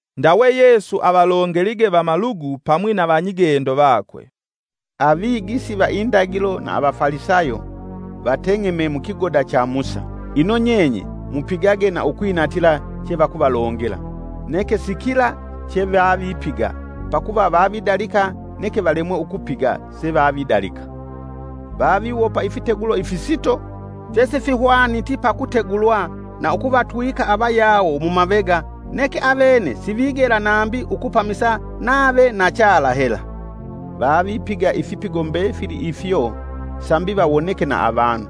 Ndawe Yesu avalongelige vamalugu pamwi na vanyigendo vakwe, “Avigisi va indagilo na avafalisayo, vateng'eme mukigoda cha Musa. Ino nyenye mupigage na ukwinatila chevakuvalongela, neke sikila chevavipiga, pakuva vavidalika neke valemwe ukupiga sevavidalika. Vaviwopa ifitegulo ifisito, fyesifihwaniti pakutegulwa na ukuvatwika avayawo mumavega neke avene sivigela nambi ukupamisa nave na chala hela. Vavipiga ifipigo mbefili ifyo sambi vawoneke na avanu.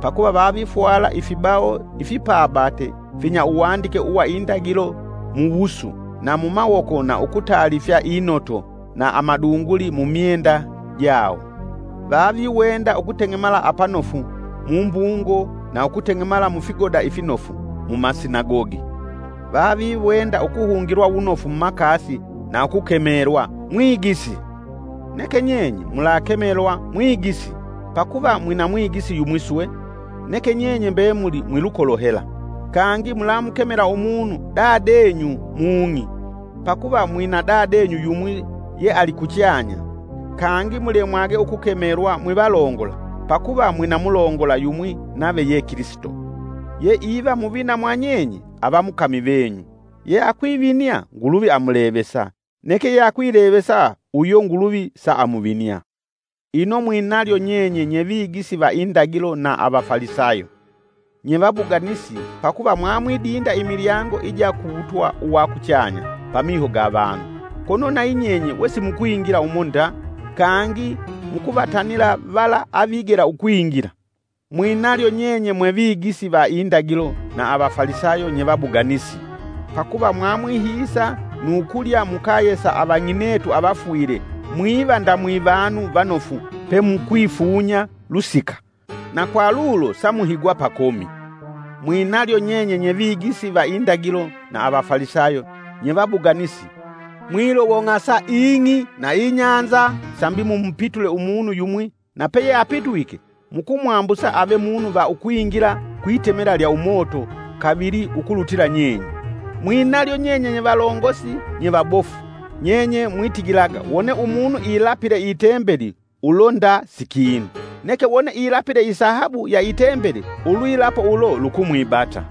Pakuva vavifwala ifibawo ifipabate finya uwandike uwa indagilo muwusu na mumawoko na ukutalifya inoto na amadunguli mumyenda jawo. Vaviwenda ukuteng'emala apanofu mumbungo, na ukuteng'emala mufigoda ifinofu mumasinagogi. Vaviwenda ukuhungilwa unofu mumakasi na ukukemelwa, ‘Mwigisi.’ Neke nyenye mulakemelwa ‘Mwigisi’, pakuva mwina mwigisi yumwi swe, neke nyenye mbemuli mwilukolo hela. Kangi mulamukemela umunu ‘Dadenyu’ mung'i pakuva mwinadadenyu yumwi yealikuchanya. Kangi mulemwage ukukemelwa mwivalongola pakuva mwina mulongola yumwi nave ye Kilisito. Ye iva muvina mwanyenye ava mukami venyu. Ye akwivinia, Nguluvi amulevesa, neke yeakwilevesa uyo Nguluvi saamuvinia. “Ino mwinalyo nyenye nye vigisi va indagilo na avafalisayo, nyevabuganisi pakuva mwamwidinda imilyango ija ku wutwa uwa kuchanya pamiho ga vanu, kono nayi nyenye we simukwingila umo nda, kangi mukuvatanila vala avigela ukwingila.” [ “Mwinalyo nyenye mwe vigisi va indagilo na Avafalisayo nyevabuganisi! Pakuva mwamwihiisa nu kulya mukaye sa avang'inetu avafwile mwiva nda mwivanu vanofu, pemukwifunya lusika. Na kwa lulo samuhigwa pakomi.] “Mwinalyo nyenye nyevigisi va indagilo na avafalisayo nyevabuganisi mwilowong'asa ing'i na inyanza sambi mumupitule umunu yumwi na peyeapitwike mukumwambusa ave munu va ukwingila kwitemela lya umoto kavili ukulutila nyenye.” “Mwinalyo nyenye nyevalongosi nyevabofu! Nyenye mwitigilaga wone umunu ilapile itembeli ulo nda sikinu; neke wone ilapile isahabu ya itembeli ulwilapo ulo lukumwibata.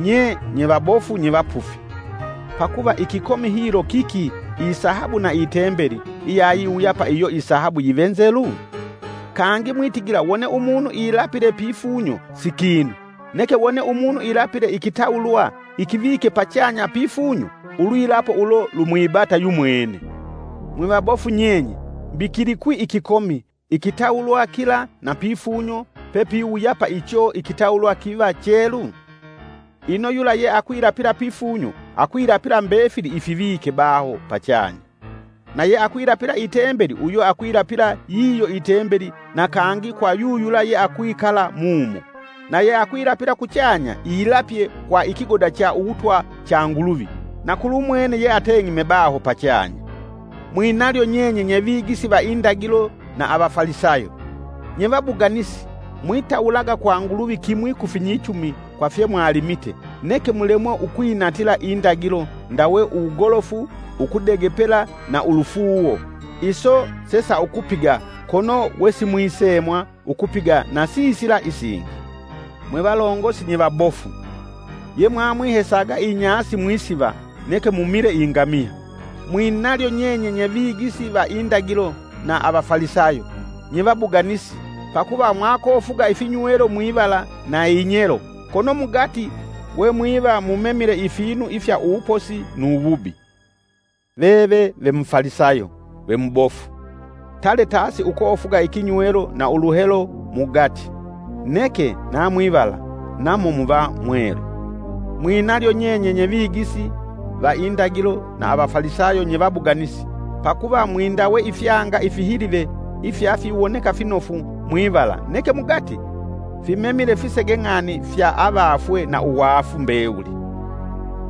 Nye nyevabofu nyevapufi! Pakuva ikikomi hilo kiki isahabu na itembeli iyayiwuyapa iyo isahabu yive nzelu? Kangi mwitigila wone umunu ilapile pifunyo sikinu; neke wone umunu ilapile ikitawulwa ikivike pachanya pifunyo ulwilapo ulo lumwibata yumwene. Mwivabofu nyenye! Mbi kilikwi ikikomi, ikitawulwa kila na pifunyo pepapiwuyapa icho ikitawulwa kiva chelu? Ino yula ye akwilapila pifunyo akwilapila mbefili ifivike baho pachanya. Na yeakwilapila itembeli uyo akwilapila yiyo itembeli na kangi kwa yuyula yeakwikala mumo. Na yeakwilapila kuchanya ilapye kwa ikigoda cha uwutwa cha Nguluvi, na kulumwene yeateng'eme baho pachanya. Mwinalyo nyenye, nyevigisi va indagilo na avafalisayo! nyevabuganisi mwitawulaga kwa Nguluvi kimwi kufinyichumi kwa fye mwalimite, neke mulemwe ukwinatila indagilo ndawe uwugolofu, ukudegepela na ulufuuwo; iso sesaukupiga kono wesimwisemwa ukupiga na sisila isingi. Mwevalongosi nyevabofu! Ye mwamwihesaga inyasi mwisiva neke mumile ingamiya!” “Mwinalyo nyenye nyevigisi va indagilo na avafalisayo, nyevabuganisi, pakuva mwakofuga ifinywelo mwivala na inyelo kono mugati we mwiva mumemile ifinu ifya uwuposi nu wubi.” Veve ve Mufalisayo ve mubofu, tale tasi ukofuga ikinywelo na uluhelo mugati, neke na mwivala namo muva mwelu. “Mwinalyo nyenye nyevigisi va indagilo na avafalisayo nyevabuganisi pakuva mwindawe ifyanga ifihilive ifyafiwoneka finofu mwivala, neke mugati fimemile fisege ng'ani fya avafwe na uwaafu mbewuli.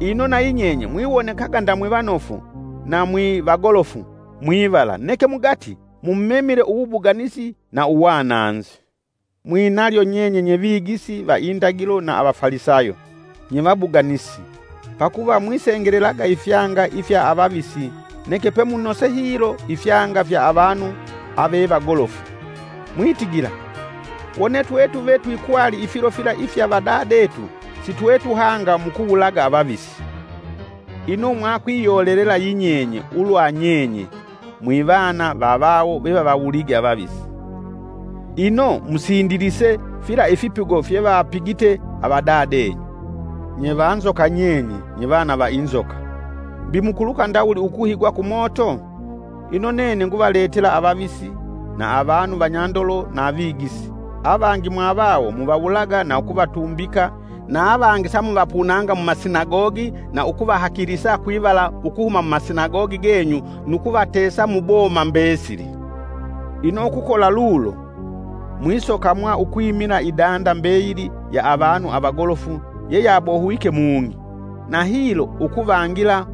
Ino nayi nyenye mwiwonekaga nda mwivanofu na mwivagolofu mwivala neke mugati mumemile uwubuganisi na uwananzi.” “Mwinalyo nyenye nyevigisi va indagilo na avafalisayo, nyevabuganisi, pakuva mwisengelelaga ifyanga ifya avavisi neke pe munose hilo ifyanga fya avanu avevagolofu. Mwitigila: ‘Wone twetuve twikwali ifilo fila ifya avadadetu sitwetuhanga mukuwulaga avavisi!’ Ino mwa kwiyolelela yi nyenye, ulwa nyenye mwivana va vawo vevavawulige avavisi. Ino, musindilise fila ifipigo fyevapigite avadadenyu! Nyevanzoka nyenye nyevana va inzoka mbi mukuluka ndawuli ukuhigwa kumoto? Ino nene nguvaletela avavisi, na avanu vanyandolo na avigisi, avangi mwavawo muvawulaga na ukuvatumbika, na avangi samuvapunanga mumasinagogi na ukuvahakilisa kwivala ukuhuma mumasinagogi genyu nu kuvatesa mu boma mbesili. Ino ukukola lulo, mwisokamwa ukwimila idanda mbeyili ya avanu avagolofu yeyabohwike mung'i. Na hilo, ukuvangila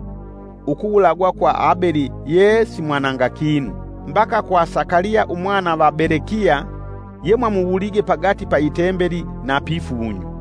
ukuwulagwa kwa Abeli yee simwananga kinu, mbaka kwa Sakaliya umwana va Belekiya, yemwamuwulige pagati pa itembeli na pifunyo.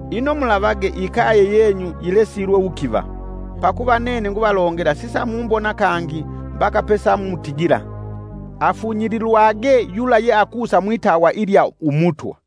Ino mulavage ikaye yenyu yilesilwe wukiva. Pakuva nene nguvalongela sisa mumbona kangi mbaka pesamutigila: ‘Afunyililwage yula ye akusa mwitawa ilya Umutwa.’”